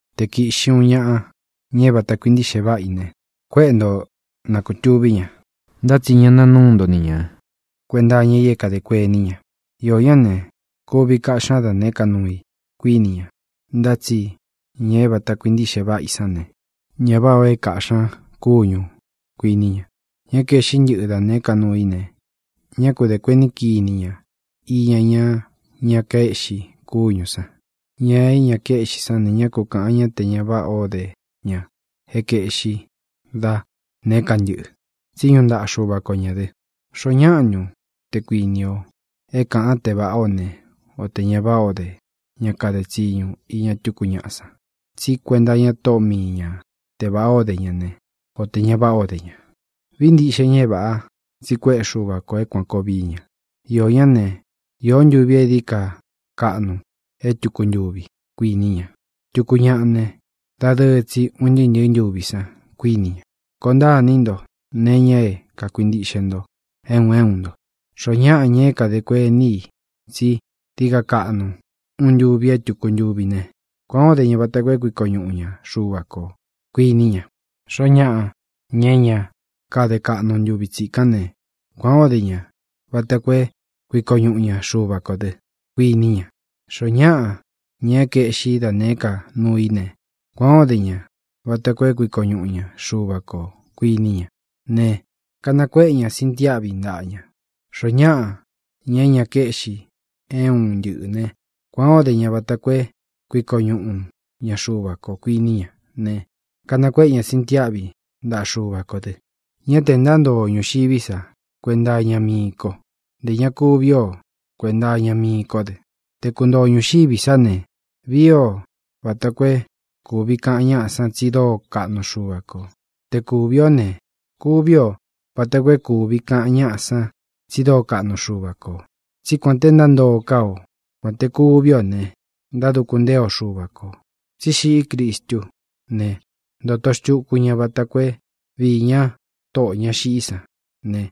Te kīꞌxi uun ñaꞌa, ña é vāta kuintíꞌxe váꞌa i ne, kuéꞌe nto na kutuvī ña. Ntá tsi ña naa núu nto ni ña kuēnta iña i é kadē kuení ña. Iō ñá ne, kuvi kaꞌxí ña da nēé ka nuu i, kuíni ña. Ntá tsi ña é vāta kuintiꞌxe váꞌa i sán ne, ñá vāꞌá ō é kāꞌxí ña kúñū, kuiní ña. Ña é kaēꞌxí ntɨꞌɨ da nēé ka nuu i ne, ñá ku dē kuení kini ña iña ña ña kaéꞌxi kúñū san. Ña é ña kaéꞌxi sán ne, ñá ku kāꞌan ñá te ña váꞌa o de ña é kaēꞌxí da nēé ka ntɨꞌɨ̄. Tsi ñúꞌu ntaꞌa Xuva ko ñā dɨ. ¿Xoó ñaꞌa ntun, te kuīni o, é kāꞌan te váꞌā ó ne, o tē ña váꞌā ó de ña kade tsiñu iña tuku ñáꞌa san? Tsí kuenta iña tóꞌo mii ña te vāꞌá o de ña ne, o tē ña váꞌā ó de ña. Vií ntiꞌxe ña é vāꞌa, tsi kuéꞌe Xuva kō é kuān koo vií ña. Iō ñá ne, īo ntúvi e dií ka kaꞌnu é tūku ntuvi, kuiní ña. Tuku ñaꞌa ne, dadɨɨ tsi un ntɨɨ́ ntɨ̄ɨ́ ntuvi san, kuíni ña. Koo ntaa iní nto nee iña é kākuintiꞌxe nto é un é un nto. Xoó ñaꞌa, ña é kadē kuení i tsi dií ka kaꞌnu uun ntuvi é tūku ntuvi ne, kuān ó de ña vata koo é kuiko ñuꞌu ña Xuva kō, kuiní ña. Xoó ñaꞌa, ña é ña káde kaꞌnu ntuvi tsikán ne, kuān ó de ña vata koo é kuiko ñuꞌu ña Xuva kō dɨ́, kuiní ña. Xoó ñaꞌa, ña é kaeꞌxí da nēé ka nuu i ne, kuān ó de ña vata koo é kuiko ñuꞌu ña Xuva kō, kuiní ña ne, kanakuéꞌe ña sintiáꞌvi ntaꞌa ña. Xoó ñaꞌa, ña é ña kaéꞌxi é un ntɨꞌɨ̄ ne, kuān ó de ña vata koo é kuiko ñuꞌu ña Xuva kō, kuiní ña ne, kanakuéꞌe ña sintiáꞌvi ntaꞌa Xuva kō dɨ. Ñá tē ntántoo o ñūxiví sa kuenta iña mii ko. Ntē ña kuví o kuēnta iña mii kó dɨ. Te kuntoo o ñūxiví sa ne, vii ō vata koo é kūvi kaꞌan ñáꞌa san tsi dóo kaꞌnu Xuva kō. Te kūvi ó ne, kuvi o váta koo é kūvi kaꞌan ñáꞌa san tsi dóo kaꞌnu Xuva kō. Tsí kuān te ntántoo ká o, kuān te kuví ō ne, ntáduku ntée o Xuva kō. Tsi xiꞌí Cristú ne, ntōto xtuku ña vata koo é viī ña Tóꞌō ña xiꞌí san ne,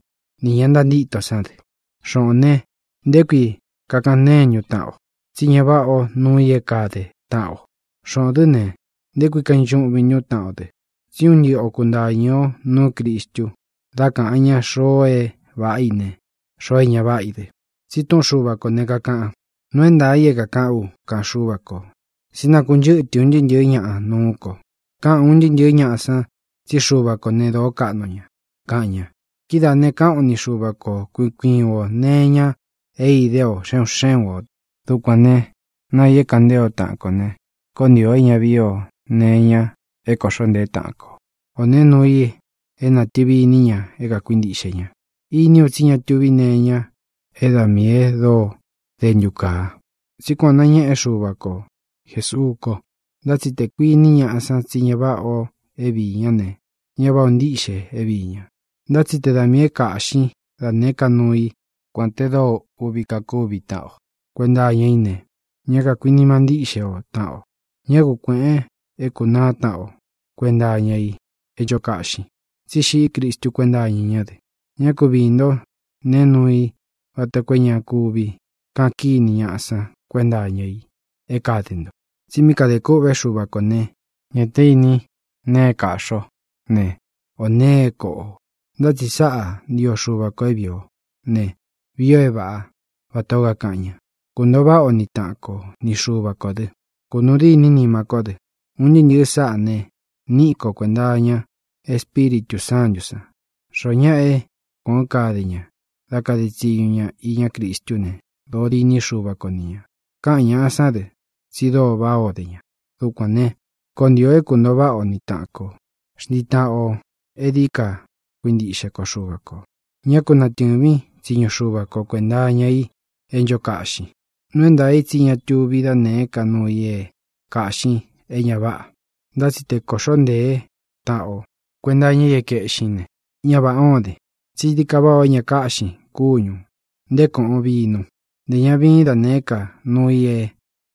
nī ña ntantíto sán dɨ. Xōꞌón ne, ¿nté kui kakaꞌan ntéen ntun taꞌan o tsí ña váꞌa ō nuu i é kade taꞌan o? Xōꞌón dɨ ne, ¿nté kui kainchuꞌvin ntún taꞌan o dɨ? Tsí un ntɨꞌɨ o kuntāñɨ ó nuú Cristu dá kāꞌan ñá xoo é vāꞌá i ne, xoo é ña váꞌa i dɨ. Tsi túꞌun Xuva kō ne, kakaꞌan: Nuu é ntaā i é kākaꞌán u, kaꞌan Xúva kō, tsí nakunchɨ́tɨ un ntɨɨ́ ntɨ̄ɨ́ ñaꞌa nuú ko. Káꞌan ūn ntɨɨ́ ntɨ̄ɨ́ ñaꞌa san tsí Xuva kō né, dōó kaꞌnu ña, kaꞌan ña. Kidáā ne, káꞌan o ni Xuva ko kui kui uun ō nee iña é idé ō xé un xé un ō. Dukuān ne, náa ī é kāꞌan ntée o taꞌan kō ne, koó ntii ō é ña vií ō nee iña é kōꞌxó ntēé taꞌan kō, o nēe nuu i é natɨ̄vi iní ña é kākuintiꞌxe ña. Iní u tsí ña tuvi nee iña é da miī e dóo dentu káa, tsí kuan ō nañéꞌe Xúva ko Jēsuú ko. Ntá tsi tē kuiní ñaꞌa san tsí ña váꞌa ō é viī ñá ne, ñá vāꞌá ō ntíꞌxe é viī ña. Ntá tsi te da miī é kāꞌxín da nēé ka nuu i, kuān te dóo uꞌvi kakúvi taꞌan o kuenta iña í ne, ñá kakuinima ntíꞌxe o taꞌan o. Ñá ku kuēꞌen é kūnaá taꞌan o kuenta iña i é ncho kaꞌxin, tsí xiꞌí Cristu kuénta iña ñá dɨ. Ñá ku viī ntó nee nuu i vata koo é ña kuvi kaꞌan kíni ñáꞌa san kuénta iña i é kade nto. Tsi mí kadē kûꞌvé Xuva kō né, ñā té ini nee é kaꞌxi o ne, ō nee é koꞌo ō. Ntá tsi sáꞌa ntio Xuva kō é vīi ó ne: Vii ō é vāꞌá, vatā ó kakaꞌan ña. Kuntōo váꞌa o ni taꞌan ko, ni Xuva kō dɨ. Kunūu dîní nima kó dɨ. Un ntɨɨ́ ntɨ̄ɨ sáꞌā ne, níꞌi ko kuēnta iña Espíritū Sántū san. Xoó ñaꞌa é kuān ó kade ña dá kade tsiñu ña iñá Cristú ne, dōo diní Xuva ko ni ñā. Káꞌan ñāꞌa sán dɨ tsi dóo váꞌā ó de ña. Dukuān ne, koó ntii ō é kuntōo váꞌa o ni taꞌan kō. Xntii taꞌan ō e dií ka kuintiꞌxe ko Xuva kō. Ñá ku natɨ̄vín tsiñu Xuva ko kuenta iña i é ncho kaꞌxin. Nuu é ntaā i tsí ña tuví da nēé ka nuu i é kāꞌxin é ña váꞌa. Ntá tsi te kōꞌxó ntēé taꞌan o kuenta iña i é kaēꞌxín ne, ñá vāꞌá o den. Tsí dií ka váꞌā o é ña kaꞌxin kúñū, nté koꞌon vinú, ntē ña viín da nēé ka nuu i é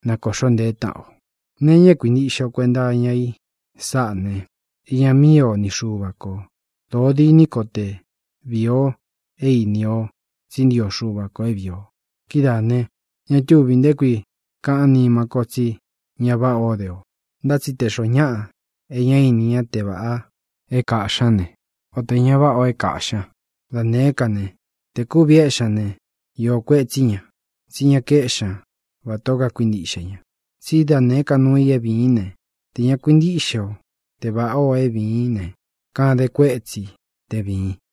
na kōꞌxó ntēé taꞌan o. Nee iña é kuintiꞌxe o kuenta iña i sáꞌā ne, iña míi o ni Xuva kō. Dōo diní ko te vīi o é īni o tsí ntio Xuva kō é vīi o. Kidáā ne, ña túvī nté kui kaꞌán nima ko tsi ña váꞌa o de ō. Ntá tsi te xōó ñaꞌa e ña íni ña te vāꞌá o é kāꞌxi ñá ne, o tē ña váꞌā o é kāꞌxi ñá da nēé ka ne, tē kuvi éꞌxi ña ne, iō kuetsí ña, tsí ña kaéꞌxi ña vatā ó kakuintiꞌxe ña. Tsí da nēé ka nuu i é vīín ne, tē ña kuintíꞌxe o te vāꞌá ō é vīín ne, kaden kuétsi te vīin.